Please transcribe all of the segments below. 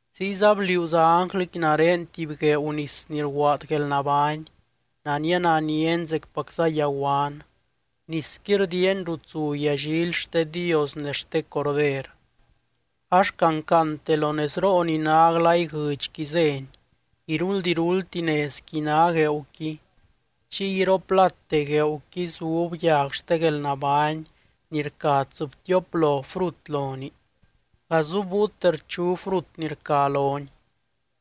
Ziyza bliuuza ánglɨqui nare tuby gueeu nis ni rguaad guelnabány, nania naniani zecpacza yaguan. Nisqui rdiiani rut zu yallily xte Dios ne xte Corder, ax cancaante lo nezroo ni ná glay guɨdxqui zéni. Iruld iruldti nezqui ná gueeuqui, chiy iroplate gueeuqui zub yag xte guelnabány ni rca tsɨbtioplo frut lonii, gazubbúiute rchu frut ni rca loni.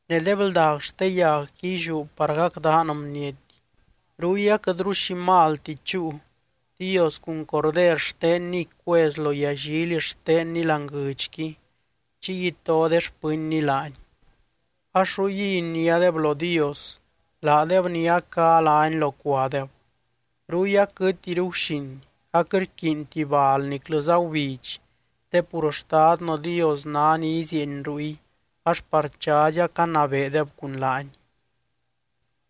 Ne de bldag xte yagqui illiú par gacdaan bniety. Ruy aquɨtru xi malti chúu, Dios cun Corder xtenniy cuez lo yallily xtenny láani guɨdxqui, chiy ito de xpɨnny laany. Ax ruyguiy iniádeb lo Dios, laadeb ni a cá lány locuadeb. Ruy aquɨtiru guxin, aquɨt rquiinti bal niclɨza gubidx te pur Xtadnɨ Dios ná ni izieeny ruy, ax par chazy acanabeedeb cun laany.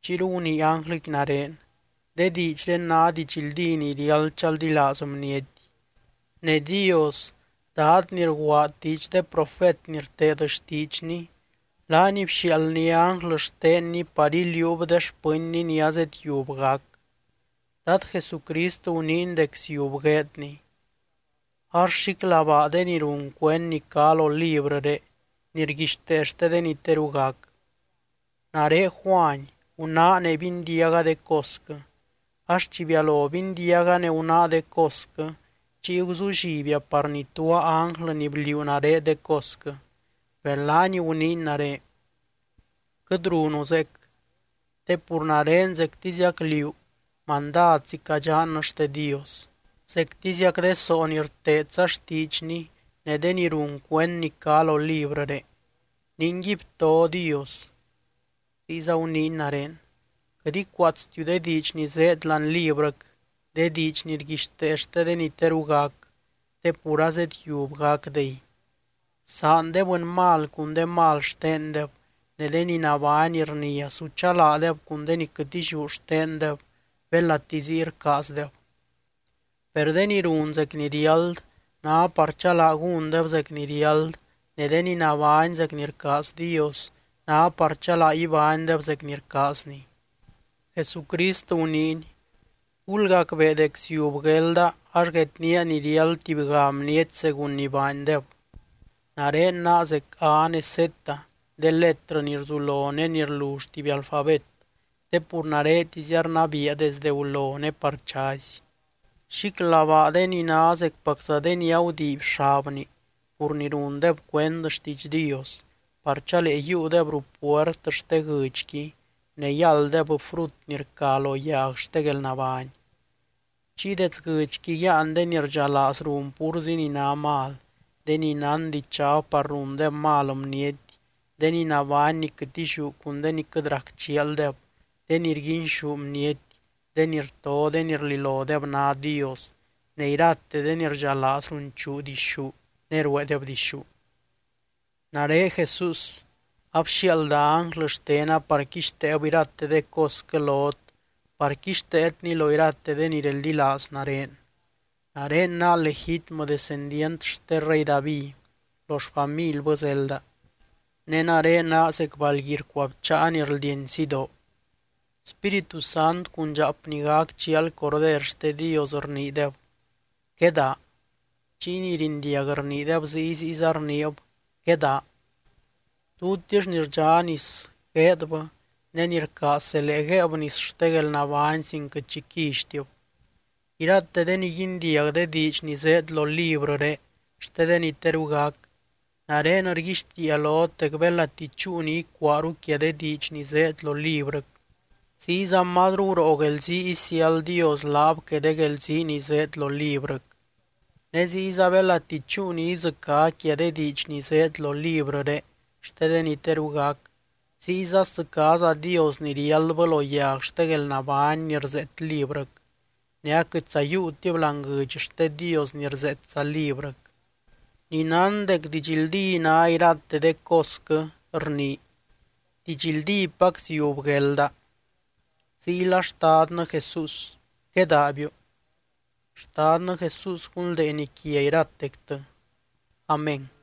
Chiyru gunii ánglɨqui nare: —De diidxré ná didxldí ni riáld chaldilaaz bniety. Ne Dios, Dad ni rguaad diidx de profet ni rteed xtiidxny, laany bxiaaldny ánglɨ xtenny par iliuub de xpɨnny ni azedyiub gac. Dad Jesucrist guniiny dec ziub gueedny. Ax, ¡xíclabaa de ni run cuend ni cá lo librɨré ni rguixtee xte de ni teru gac! Nare Juany, gunáa ne bindiaga de cosquɨ. Ax chi bialo bindiaga ne gunáa de cosquɨ, chiy guzullibia par nituaa ánglɨ ni bliuu nare de cosquɨ. Per laany guniiny nare: —Quɨt runu zeec. Te pur nare zectiziac liú, mandadzi cadxannɨ xte Dios, zectiziac de soo ni rteedza xtiidxny ne de ni run cuend ni cá lo librɨré. Ningui, bto Dios. Ziyza guniiny nare: —Quɨt icuaatstiu de diidx ni zéed láani librɨc, de diidx ni rguixtee xte de ni teru gac, te pur azedyiub gacdey. Bsaan de bɨny mal cun de mal xtendeb, ne de ni nabány rnia su chalaadeb cun de ni quɨt illiú xtendeb belati ziy rcaazdeb. Per de ni run zec ni riáld ná par chalaa gúndeb zec ni riáld ne de ni nabány zec ni rcaaz Dios ná par chalaa ibánydeb zec ni rcaazny. Jesucrist guniiny: —Gulgacbee dec ziub guelda, ax guednía ni riáld tubyga bniety según ni baandeb. Nare naa zec A ne Z, de letrɨ ni rzulo ne ni rlull tuby alfabet, te pur naretizia rnabiia desde gulo ne par chazy. Xíclabaa de ni ná zecpacza de ni agudiiby xabni pur ni rundeb cuend xtiidx Dios, par chalee yiiudeb ruu puert xte guɨdxqui ne yálddeb frut ni rca lo yag xte guelnabány. Chiy dets guɨdxqui yáan de ni rdxalaaz run púrzi ni ná mal, de ni nán dichab par rundeb mal bniety, de ni nabány ni quɨt illiú cun de ni quɨt rac chialdeb, de ni rguinxú bniety, de ni rto de ni rlilodeb ná dios, ne irate de ni rdxalaaz runchuu dixú ne rueedeb dixú. —Nare Jesús, abxiaalda ánglɨ xtena par quixteeb irate de cosquɨ lot par quixteetni lo irate de ni reldilaaz nare. Nare naa legítmɨ descendient xte rey David, lo xfamilbɨ zelda. Ne nare naa zec balgui rcuabcháa ni rldieny sidoo. Spíritu Sant cun dxaap ni gac chial Corder xte Dios, rniideb: —Quedaa. Chiy ni rindiag rniideb ziy, ziyza rniib: —Quedaa. Tutix ni rdxá nis, gueedbɨ, ne ni rcaaz zelee guéeb nis xte guelnabány sin quɨt xi quillytib. Irate de ni guindiag de diidx ni zéed lo librɨré xte de ni teru gac, nare rguixtiia lot dec belati chúu ni icuaaru quia de diidx ni zéed lo librɨc, ziyza mazru guroo guelzii isiáld Dios laab que de guelzii ni zéed lo librɨc. Ne ziyza belati chúu ni idzɨcá quia de diidx ni zéed lo librɨré xte de ni teru gac, ziyza sdzɨcáza Dios ni riáldbɨ lo yag xte guelnabány ni rzeet librɨc, ne aquɨtza yiiutib láani guɨdx xte Dios ni rzeetza librɨc. Ni nán dec didxldí ná irate de cosquɨ, rnii: —Didxldípac, ziub guelda. Ziyla Xtadnɨ Jesús, ¡quedaabiu! Xtadnɨ Jesús gunldeeny quia iratectɨ. Amén.